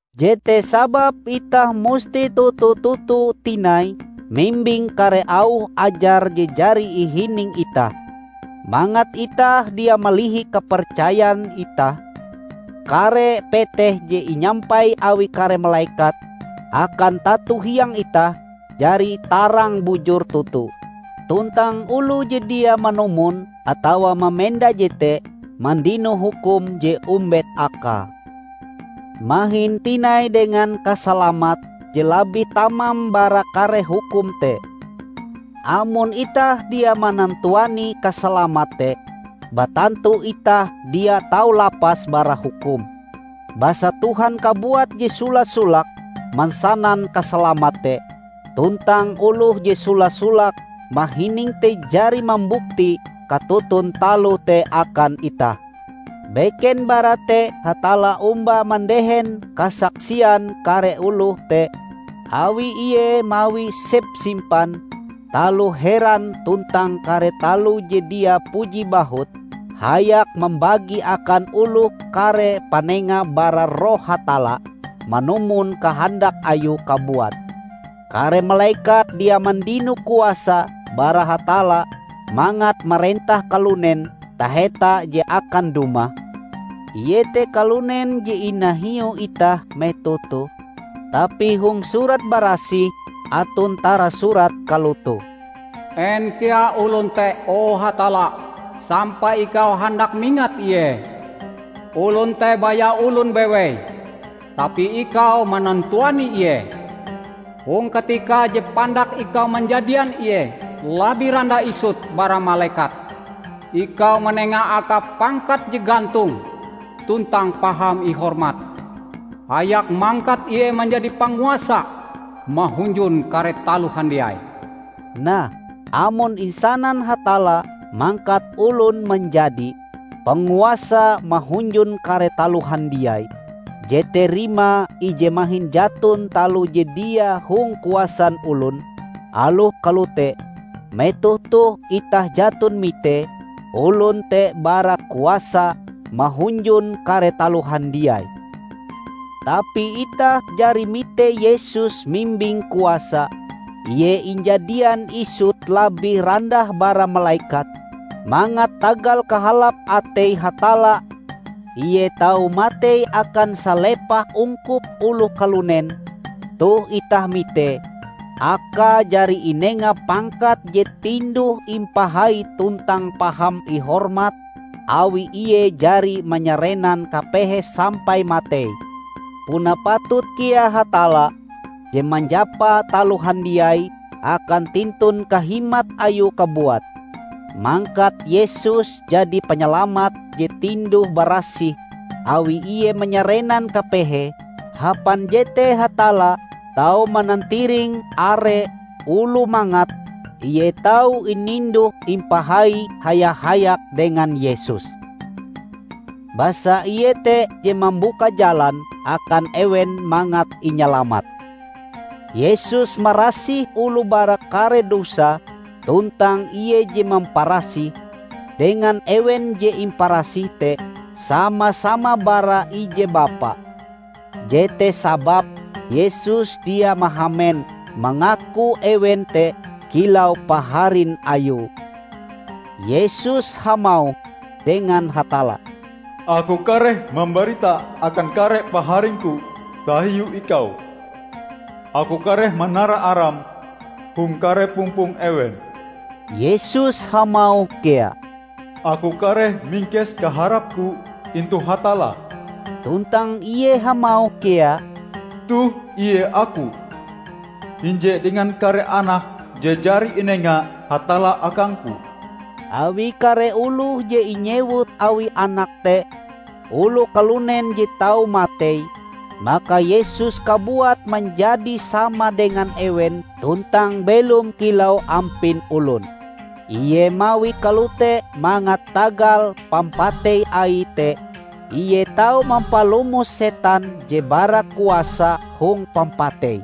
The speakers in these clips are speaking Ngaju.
Jete sababe itah musti toto-toto tinai mimbing kare auh ajar je jari ihining itah, mangat itah dia malihi kapercayan itah. Kare peteh je inyampai awi kare malekat akan tato hiang itah jari tarang bujur toto, tuntang oloh je dia manumon atawa mamenda jete mandino hukum je ombet akae. Mahin tinai dengan kasalamat je labih tamam bara kare hukum te! Amon itah dia manantuani kasalamat te, batantu itah dia tau lapas bara hukum. Basa Tuhan kabuat je sola-solake mansanan kasalamat te, tuntang oloh je sola-solake mahining te jari mambukti katoton taloh te akan itah. Beken bara te Hatalla omba mandehen kasaksian kare oloh te awi Ie mawi sepsimpan taloh heran tuntang kare taloh je dia puji bahut hayak mambagi akan oloh kare panenga bara Roh Hatalla manumon kahandak Ayue kabuat. Kare malekat dia mandino kuasa bara Hatalla mangat marentah kalunen taheta je akan dumah, iete kalunen je inahiu itah metoh toh. Tapi hong Surat Barasih aton tarasurat kalotoh, "En kea olon te, o Hatalla, sampai ikau handak mingat ie? Olon te baya olon bewei, tapi ikau manantuani ie! Hong katika je pandak ikau manjadian ie labih randah isut bara malekat. Ikau manenga akae pangkat je gantong tuntang paham ihormat hayak mangkat ie manjadi panguasa mahunjun kare taloh handiai." Nah, amon insanan Hatalla mangkat olon manjadi "panguasa mahunjun kare taloh handiai", jete rimae ije mahin jaton taloh je dia hong kuasan olon. Aloh kalote, metoh toh itah jaton mitee olon te bara kuasa mahunjun kare taloh handiai. Tapi itah jari mite Yesus mimbing kuasa! Ie injadian isut labih randah bara malekat, mangat tagal kahalap atei Hatalla Ie tau matei akan salepah ungkup oloh kalunen. Toh itah mite, Akae jari inenga pangkat je tinduh-impahai tuntang paham ihormat awi Ie jari manyarenan kapehe sampai matei. Puna patut kea Hatalla -- je manjapa taloh handiai akan tintun kahimat Ayue kabuat -- mangkat Yesus jadi panyalamat je tinduh barasih awi Ie manyarenan kapehe. Hapan jete Hatalla tau manantiring are oloh mangat Ie tau ininduh-impahai haya-hayak dengan Yesus. Basa Ie te je mambuka jalan akan ewen mangat inyalamat. Yesus marasih oloh bara kare dosae; tuntang Ie je mamparasih, dengan ewen je imparasih te, sama-sama bara ije Bapa. Jete sababe Yesus dia mahamen mangaku ewen te kilau paharin Ayue. Yesus hamauh dengan Hatalla, "Aku kareh mambarita akan kare paharing-Ku tahiu Ikau. Aku kareh manara Aram hong kare pumpong ewen." Yesus hamauh kea, "Aku kareh mingkes kaharap-Ku intu Hatalla." Tuntang Ie hamauh kea, "Toh Ie Aku, hinje dengan kare anak je jari inenga Hatalla akang-Ku." Awi kare oloh je inyewut Awie anak te, oloh kalunen je tau matei, maka Yesus kabuat manjadi sama dengan ewen tuntang belom kilau ampin olon. Ie mawie kalote mangat tagal pampatei Aie te Ie tau mampalomos setan je bara kuasa hong pampatei.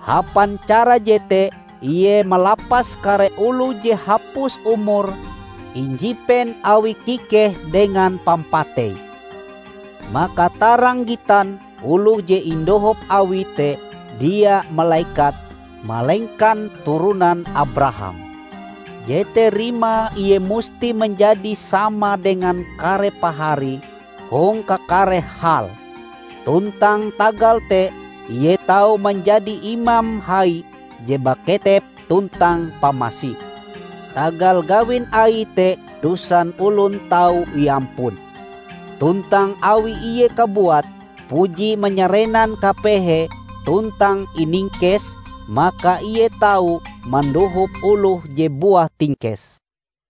Hapan cara jete Ie malapas kare oloh je hapus umure injipen awi kikeh dengan pampatei. Maka tarang gitan oloh je indohop Awie te dia malekat, malengkan turonan Abraham. Jete rimae Ie musti manjadi sama dengan kare paharie hong kakare hal. Tuntang tagal te Ie tau manjadi Imam Hai je baketep tuntang pamasi. Tagal gawin Aie te dosan olon tau iampun. Tuntang awi Ie kabuat puji manyarenan kapehe tuntang iningkes, maka Ie tau mandohop oloh je buah tingkes.